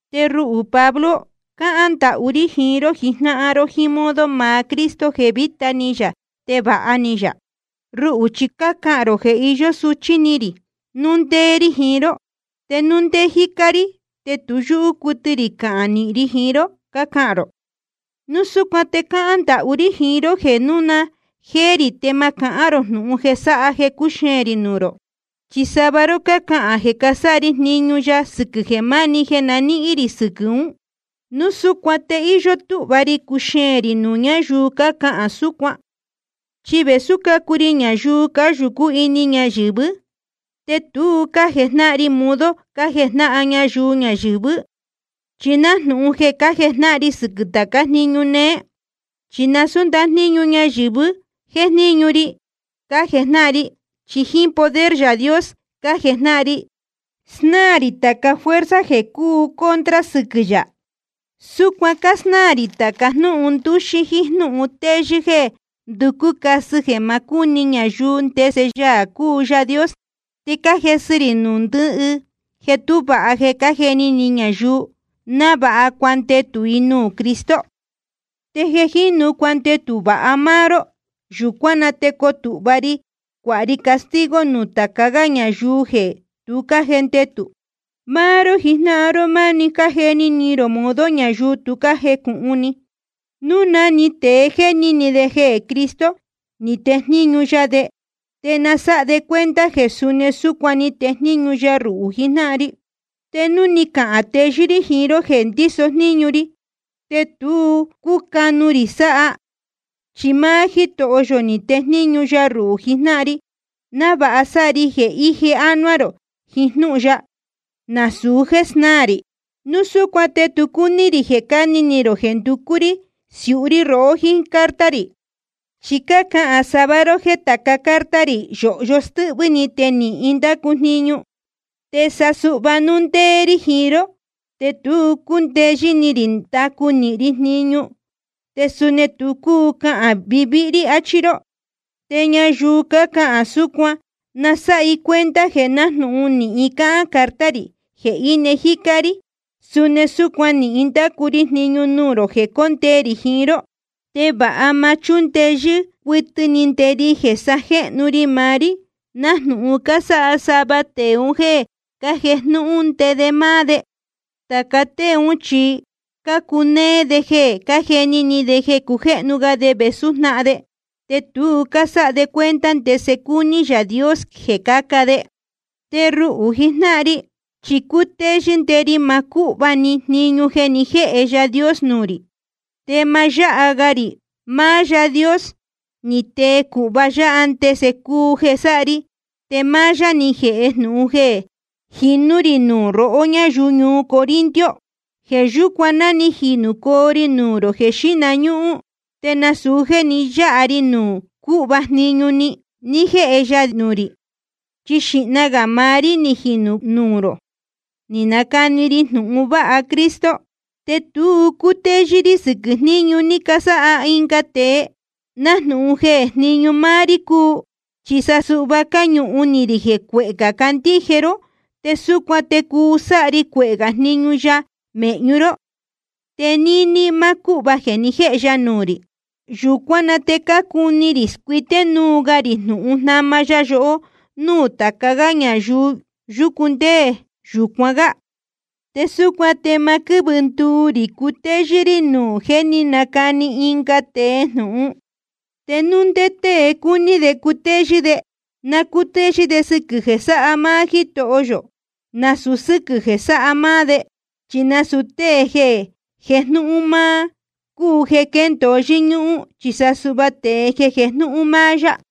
Te ruhū Pablo, cáhán ndahú rí jiín ró jijnáhan ró jíín modo maá Cristo jeē vītá ni yā te vāha ni yā. Ruhū, chi cácahān rō jeē iyó suchí ni rī núu ndéé rí jiín ró, te núu ndéé jícá rí te tu yúhú cuɨtɨ rī cahān nīhin ri jiín ró, cácahān rō. Núu súcuan te cáhán ndahú rí jiín ró jeē núu na jéé rī te ma cahán rō jnūhun jeē sáha jeē cuxeēn rī nuū rō. Chi sava ró cácahān jeē casáha ri jniñu ya sɨquɨ̄ jeē máni jeē na níhín rī sɨquɨ̄ ún. Núu súcuan te íyó túhva ri cuxeēn rī nuū ñáyuu cácahān súcuan. Chi vēsú cácuu ri ñayuu cáyūcú ini ñayɨ̄vɨ́, te tu cájejnáhan ri modo cájejnáhan ñayuu ñayɨ̄vɨ́. Chi nájnūhun jeē cájejnáhan ri sɨquɨ̄ tācá jniñu neé. Chi nasūú ndajníñu ñayɨ̄vɨ́ jéjníñu ri cájejnáhan ri, chi jíín poder Yaā Dios cájejnáhan ri snáā rī tāca fuerza jeē cúu contra sɨquɨ̄ yā. Súcuan cásnáā rī tāca jnúhun ndúxí jíín jnúhun téyɨ́ jeē nducú casɨ jeē ma cúni ñayuu ndese Yaā cúu Yaā Dios. Te cájesɨ ri nuū ndɨhɨ jeē tú vāha jeē cájeni ni ñayuu, návāha cuandetū i nuū Cristo. Te jeē jínu cuandetū vāha máá ró, yūcuán na te coo tūhva ri cuāha ri castigo nuū tāca gá ñayuu jeē tu cájendetū. Máá ró jijnáhan ró máni cájeni ni rō modo ñayuu tu cájecūhun ni. Núu na‑ni tēe jéni ni de jeē Cristo ni tejníñu ya de, te na sáha de cuenta jeē suni súcuan ni tejníñu ya ruhū jijnáhan ri. Te núu ni cahān teyɨ́ rí jiín ró jeē ndíso jníñu ri, te tu cúcanu rī sáha. Chi máá Jítoho yō ni tejníñu ya ruhū jijnáhan ri, návāha sáha ri jeē ije ánuá rō jiín jnúhun ya, nasūu jéē snáā rī. Núu súcuan te tu cúní rī jeē cáni ni rō jeē nducú rí siúhú rí rohó jíín carta rī. Chi cácahān sava ró jéē tāca carta rī yōhyo stɨ́hvɨ́ ni te nīhin ndácu jniñu, te sa suhva núu ndéé rí jiín ró te tu cúndeyɨ́ ni rī ndacu nīhin ri jniñu, te suni tu cúu cahān vāvíhí rí, achí ró. Te ñayuu cácahān súcuan na sáha i cuenta jeē nájnūhun nīhin cáhán carta rī jeē íne jícá rí, suni súcuan nīhin ndacu ri jniñu nuū rō jeē cóndee rī jiín ró. Te va ma chúndeyɨ́ cuɨtɨ ni nde ri jeē sajéhnu ri maá rí, nájnūhun cásáha sava tēe un jéē cájejnúhún nde de máá de. Tāca tée ún chi cácunéé de jeē cájeni ni de jeē cujéhnu ga de vēsú jnáhan de, te tu cásáha de cuenta ndese cúní Yaā Dios jeē caca de. Te ruhū jijnáhan ri, chi cutéyɨ́ nde ri maá cúhva‑ni jniñu jeē ni jéhe Yaā Dios nuū rī, te ma yáha ga rī. Máá Yaā Dios ni tee cūhva yá ndésaa cúu jeē sáha ri, te máá yá ni jēhe jnūhun jeē ni jínū rī nuū rohó ñáyuu ñuu Corinto. Jeē yúcuan ná ni jinūcoo ri nuū rō jeē xíhna ñúhún te nasūu jéē ni yáha ri nuū cúhva jniñu ní jéhe ya nuū rī. Chi xīhna gā maá rí ni jinūcoo nuū rō ni canacani ri jnūhun vāha Cristo. Te tu cácutéyɨ́ rí sɨquɨ̄ jníñu ní casáha ɨnga tēe, nájnūhun jeē jníñu máá rí cúu. Chi sa suhva cáñuhun ni rī jeē cuehē gā candíje ró, te súcuan te cuu sáha ri cuehē gā jniñu ya mēhñu ró, te níní máá cúhva jeē ni jéhe ya nuū rī. Yūcuán na te cácuni rī scuité núu ga rī jnūhun jnáma ya yohó núū tāca gá ñuu yúcu ndé yūcuan gá. Te súcuan te ma quɨ́vɨ nduu rī cutéyɨ́ rí nuū jeē jé ni canacani ɨnga tēe jnūhun. Te núu ndé tée cúní de cutéyɨ́ de, na cútéyɨ́ de sɨquɨ̄ jeē sáha máá Jítoho yō, nasūu sɨ́quɨ̄ jéē sáha máá de. Chi nasūu tée jeē jejnúhún máá cúu jeē quéndōo yɨ́ñúhún, chi sa suhva tēe jeē jejnúhún máá yá.